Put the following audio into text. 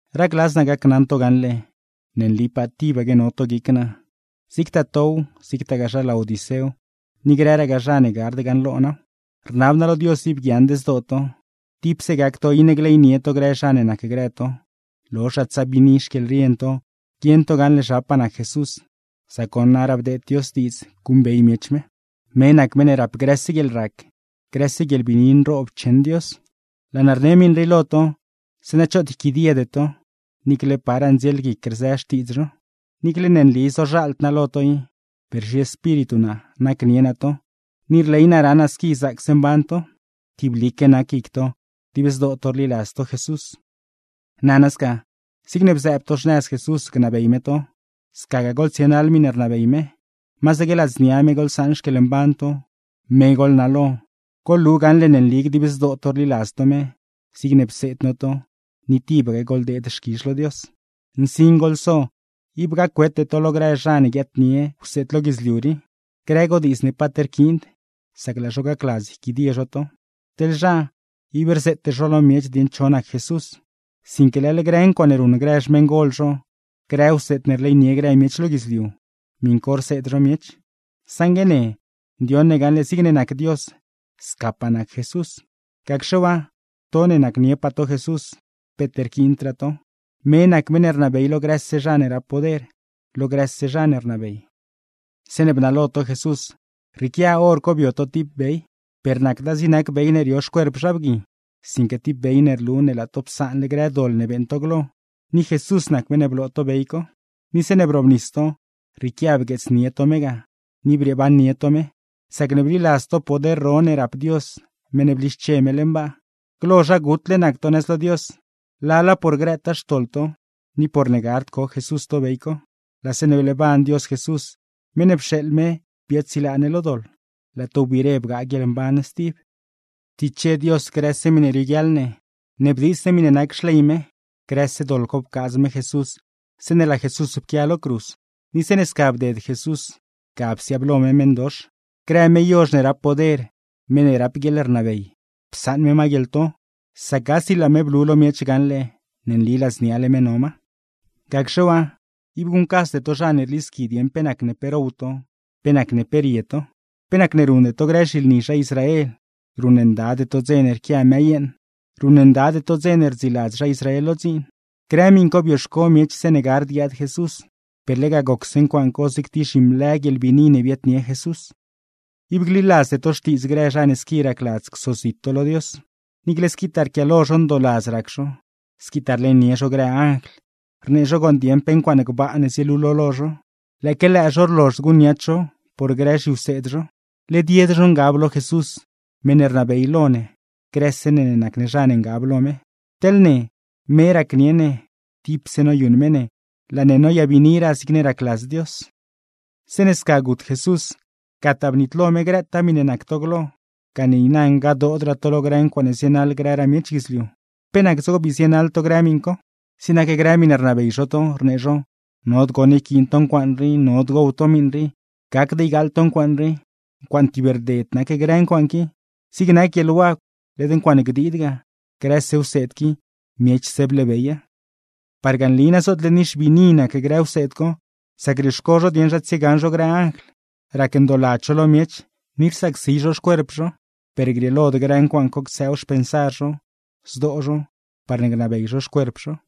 Racladz naa gacnaṉ to gaṉle ne nlipaa tibaque no to guic naa, zigtaa tow, zigtagaa zha Laodicéw, ni grëragaa zha ne gard gaṉlo naaw. Rnab naa lo Dios ib guiaaṉd zdoo to, tipse gac to iṉe gleynie to grë zha ne nacgrë to, lozhraa tsaa biini xquieḻrien to guieṉ to gaṉle zhapaa nac Jesús, sac goṉ naraa bdeed Dios diidz guṉbey miech me. Me nac meṉ ne rap grëse guieḻrac, grëse guieḻbiini nroob cheṉ Dios. Laa naa rne miṉ rii lo to, zeeṉa choot yquidiede to, niicle paraa ndzielguic rzë xtiidz zho. Niicle ne nli zozhaald naa lo to i, per zhiespíritu naa nacnie naa to, ni rley naa raṉ naa squi zaacse mban to, tiblique nac guic to dib zdoo to rliladz to Jesús. Nana sca, zigne bzëëb to xnëz Jesús gnabey me to, scagaa goḻtsienaḻ miṉe rnabey me, masaque ladznia me goḻsaṉ xquieḻmban to, me goḻnalo, goḻlu gaṉle ne nli dib zdoo to rliladz to me, zigne pseed no to, ni tibaque goḻdeed xquizh lo Dios. Nsin goḻso: ib gac-wete to lo grë zha ne guiaadnie wseed lo guidzliu rii, grë godiidz ne paat rquiind, sac laa zho gacladz yquidie zho to. Teḻ zha, ib rzeete zho lo miech dieṉ cho nac Jesús, sinque leḻ grë ncuaaṉe ruṉ grë xmeṉgol zho, grë wseed ne rleynie grë miech lo guidzliu, miṉ co rseed zho miech. Saṉgue ne, ndioṉ ne gaṉle zigne nac Dios scapaa nac Jesús. Gacxe waa, to ne nacnie to Jesús, peet rquiindraa to. Me nac meṉ ne rnabey lo grëse zha ne rap poder, lo grëse zha ne rnabey. Zeeṉe bnalo to Jesús rrieequia hor co bio to tib bey, per nacda zig nac bey ne rio xcuerp zha bgui, sinque tib bey ne rlu ne laa to psaanle grë doḻ ne beeṉ to glo; ni Jesús nac meṉ ne bloo to bey co. Ni zeeṉe brobnis to, rrieequia bgueetsnie to me ga ni brieebannie to me, sacne bliladz to poder ro ne rap Dios meṉ ne blische me leṉ baa. Glo zha gutle nac to nëz lo Dios, lala por grëtaa xtoḻ to ni porne gard co Jesús to bey co; laa zeeṉe bleeban Dios Jesús, meṉ ne pxeeḻ me biaadsilaa ne lo doḻ, laa to wbiire bgaa guieḻmban stib. Ptiche Dios grëse miṉe rioguiaḻ ne, sac bdiits ne miṉe nac xley me; grëse doḻ co pcaadz me Jesús zeeṉe laa Jesús pquia lo cruz. Ni zeeṉe sca bded Jesús, ga psiaablo me meṉdox; grë me yozh ne rap poder, me ne rap guieḻrnabey, psaṉ me ma guieḻto; sac gasi laa me blu lo miech gaṉle ne nli ladzniale me no ma. Gacxe waa, ib guṉcasde to zha ne rlisqui dieṉ pe nacne pe row to, pe nacne pe rie to, pe nacne ruṉde to grë zhilni zha Israel, ruṉndade to dze ne rquia mëë yeeṉ, ruṉndade to dze ne rdziiladz zha Israel lo dziin. Grë miṉ co bioxco miech zeeṉe gard guiaad Jesús, per lega gocse ncuaaṉ co zig tib zhimlë guieḻbiini ne biaadnie Jesús. Ib gliladzde to xtiidz grë zha ne squi racladz csozit to lo Dios, niicle squitaa rquiaalo zho ndooladz rac zho, squitaa rleynie zho grë anjl, rnee zho gooṉ dieeṉ pe ncuaaṉe gbaa ne zielulo lo zho, lëëque lëë zho rlozhd guṉniats zho por grë zhiwseed zho. Led yed zho ngab lo Jesús, meṉ ne rnabey lo ne grëse ne ne nac ne zha ne ngab lo me. Teḻ ne, me racnieṉ ne, tipse noyuṉ me ne, laa ne noyabiiniraa zigne racladz Dios. Zeeṉe sca gut Jesús, gataa bnitlo me grëtaa miṉe nac to glo, gane niina ngadoodraa to lo grë ncuaaṉe zienaḻ grëraa miech guidzliu. ¿Pe nac dzigo ne bii zienaḻ to grë miṉ co? Zig nac grë miṉe rnabey zho to, rnee zho: “Nod goṉ yquiin to ncuaaṉ rii, nod gow to miṉ rii, gacd ygaaḻ to ncuaaṉ rii.” Ncuaaṉe tib rded nac grë ncuaaṉe qui, zig nac guieḻwagw led ncuaaṉe gdiid ga, grëse wseed qui miechse bleebeya. Parga nli na zootle nixbiini nac grë wseed co, sac rioxco zho dieṉ zha tsiegaṉ zho grë anjl, rac ndooladz zho lo miech, ni rsacsi zho xcuerp zho; per rrieelod grë ncuaaṉ co ctsëëw xpensar zho, zdoo zho, parne gnabey zho xcuerp zho.